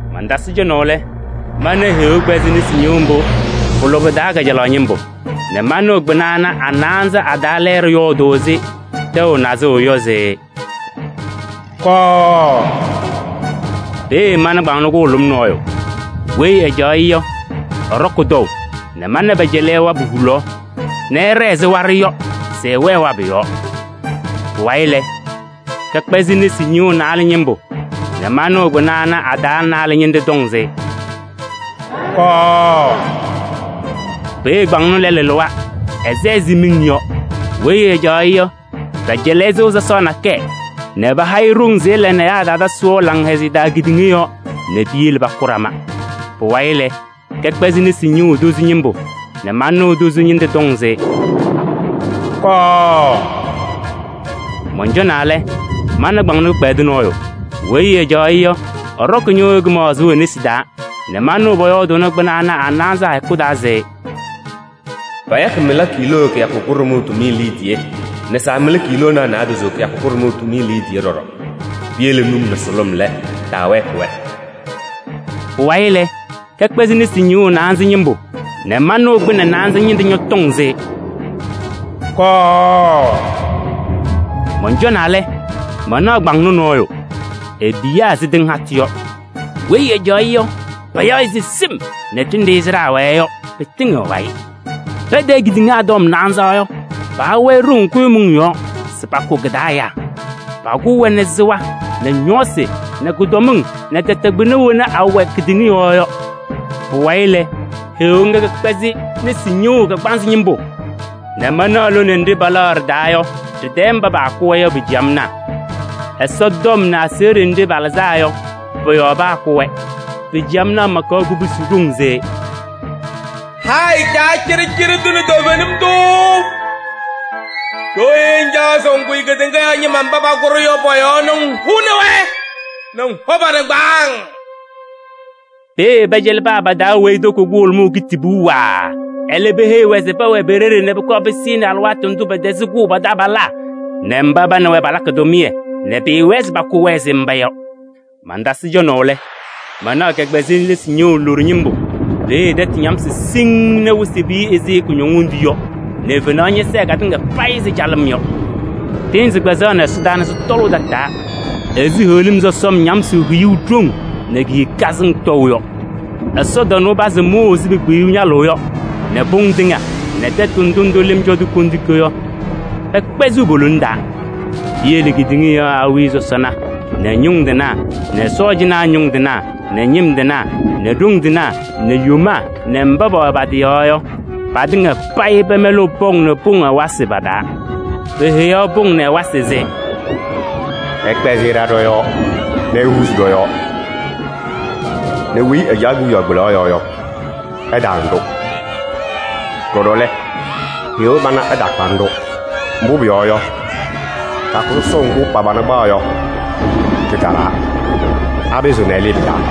Mantasɩ cɔnaʋ lɛ, mana Heɣa kpɛzɩ nesi ñɩɣʋ mbʋ pʋ-lʋbɛ taa kajalaɣ ñɩmbʋ nɛ manɩɣ kpɩna ana a-naanza a-taa lɛɛɖɛ yɔɔdʋʋ ɛzɩ tɛʋ nazʋʋ yɔ se: “Kɔɔ!” Peeye mana kpaŋnɔ kʋhʋlʋm nɔɔyʋ. Weyi ɛcaɣ-ɩ yɔ, ɛɖɔkɩ tɔʋ nɛ mana pɛcɛlɩ-ɩ wabʋ hulaɣ nɛ ɛɖɛɛ ɛzɩ waɖʋ yɔ se ɛwɛɛ wabʋ yɔɔ. Pʋwayɩ lɛ, kɛkpɛzɩ nesi ñɩɣʋ naalɛ ñɩmbʋ nɛ manɩɣ kpɩna ana a-taa naalɛ ñɩnɖɛ tɔŋ se: “Kɔɔ!” Peeye kpaŋnɔ lɛlʋ lɩwa, ɛsɛ ɛzɩ miŋ yɔ. Weyi ɛcaɣ-ɩ yɔ, pɛcɛlɩ-ɩ sɩɣa sɔsɔɔ nakɛyɛ nɛ paha-ɩ ɖoŋ se ɛla nɛ ɛyaa ɛtaatasɩ wɛʋ laŋhɛzɩyɛ taa kedeŋa yɔɔ nɛ piyele pakʋ ɖama. Pʋwayɩ lɛ, kɛkpɛzɩ nesi ñɩɣʋ tozo ñɩmbʋ nɛ manɩɣ tozo ñɩnɖɛ tɔŋ se: “Kɔɔ!” Mɔncɔnaa lɛ, mana kpaŋnɔ kɩkpɛdʋ nɔɔyʋ. Weyi ɛcaɣ-ɩ yɔ, ɛɖɔkɩ ñɩɣyʋʋ kɩmaɣzʋʋ e-nesi taa nɛ manɩɣ pʋyɔɔdʋʋnɩ kpɩna ana a-naanza a-hɛkʋ taa se: “Payakɩ mɩla kiiloo kɩyakʋ kʋɖʋmʋʋ tʋmɩyɛ liidiye nɛ saamɩla kiiloonaa naadozo kɩyakʋ kʋɖʋmʋʋ tʋmɩyɛ liidiye ɖɔɖɔ. Piyele num nɛ sʋlʋm lɛ, taawɛɛkɩ-wɛ.” Pʋwayɩ lɛ, kɛkpɛzɩ nesi ñɩɣʋ naanza ñɩmbʋ nɛ manɩɣ kpɩnɛ naanza ñɩnɖɛ ñɔtɔŋ se: “Kɔɔ!” Mɔncɔnaa lɛ, mana kpaŋnɔ nɔɔyʋ, epiyaa ɛzɩ tɩŋ hatʋ yɔ. Weyi ɛcaɣ-ɩ yɔ, payaɣ-ɩ se Sɩm nɛ ɖenɖe sɩɖaa wɛɛ yɔ pɩtɩŋɩɣ ɛ-wayɩ. Patayɩ kedeŋa tɔm naanza yɔ, paha-wɛ ɖoŋ kʋɖʋmʋʋ yɔɔ se pakʋ kɩ-taa ɛyaa. Pakʋʋ-wɛ nɛ sɩɣa nɛ ñɔɔsɩ nɛ kʋdɔmɩŋ nɛ tɛtɛ kpɩna wena awɛ kedeŋa yɔɔ yɔ. Pʋwayɩ lɛ, Heɣa ŋga kɛkpɛzɩ nesi ñɩɣʋ kagbaanzɩ ñɩmbʋ nɛ manaɣ lone nɖɩ palaɣ ɖɩ-taa yɔ, ɖɩ-tɛɛ mba paakʋ-wɛ yɔ pa-ciyamnaa. Ɛsɔtɔm nɛ aseɣɖe nɖɩ palɩzaa yɔ, pɔ-yɔɔ paakʋ-wɛ. Pa-ciyamnaa makaɣ kubusi ɖoŋ se: “Hayɩ Caa cɩɖɩcɩɖɩ tʋ nɛ toovenim tʋ! Ɖooye ŋcaɣ se ŋkʋyɩ kedeŋa yɔɔ ñɩma mba pakʋ-ɖʋ yɔ pɔ-yɔɔ nɛ ŋhʋnɩ-wɛ nɛ ŋhɔ pa-nɩŋgbaaŋ?” Peeye pɛcɛlɩ paa pa-taa weyi toko kʋhʋlʋmʋʋ kitibuu waaa. Ɛlɛ, peheyi-wɛ se pɛwɛɛ pe-ɖeɖe nɛ pʋkɔɔ pɩsɩnɩ alɩwaatʋ ndʋ pɛtɛzɩ kʋʋ pa-taabalaa nɛ mba pa nɛ wɛ palakɩ tʋmɩyɛ, nɛ pɩɩwɛɛ se pakʋ-wɛ ɛzɩ mba yɔ. Mantasɩ cɔnaʋ lɛ, mana kɛkpɛzɩ nesi ñɩɣʋ loɖo ñɩmbʋ, peeye tɛtʋ ñamsɩ siŋŋ nɛ wɩsɩ piyi ɛzɩ kʋñɔŋ wondu yɔ nɛ fenaɣ sɛɛ katɩŋa payɩ ɛzɩ calɩm yɔ. Tɩɩnzɩ kpɛzaɣnɩ ɛsɔdaa nɛ sɩtɔlʋʋ tataa ɛzɩ heɣlim sɔsɔm ñamsʋʋ hiyuu ɖoŋ nɛ ki-hiwee kazɩŋ tɔʋ yɔ. Ɛsɔtɔnʋʋ pazɩ mʋʋʋ ɛzɩ pekpiyuu ñalʋʋ yɔ nɛ pʋŋ tɩŋa nɛ tɛtʋ ndʋ ndʋ lɩm cɔ-tʋ kondiko yɔ, pɛkpɛzɩɣ po-lona taa. Piyele kedeŋa yɔɔ awiya sɔsɔna nɛ ñʋŋ tɩnaa nɛ sɔɔjanaa ñʋŋ tɩnaa nɛ ñɩm tɩnaa nɛ ɖoŋ tɩnaa nɛ yomaa nɛ mba pɛwɛ pa-tɩ yɔɔ yɔ, patɩŋa payɩ pɛmɛlɩɣ pɔŋ nɛ pʋŋ ɛwasɩ pa-taa. Peheyaɣ pʋŋ nɛ ɛwasɩ se: “Ɩkpɛzɩ ɩɖa ɖɔ-yɔɔ nɛ ihuuzi ɖɔ-yɔɔ nɛ weyi ɛcaɣ kewiyaɣ kpelaɣ yɔɔ yɔ, ɛtaana-ɖʋ. Ɖɔɖɔ lɛ, Heɣa pana ɛtaakpanɩ-ɖʋ. Mbʋ pʋyɔɔ yɔ, kɩyakʋ sɔsɔʋ ŋgʋ pa-pana kpaɣ yɔ, kɩtalaa. Apɩzɩɣ ɛlɩɩ pɩ-taa?”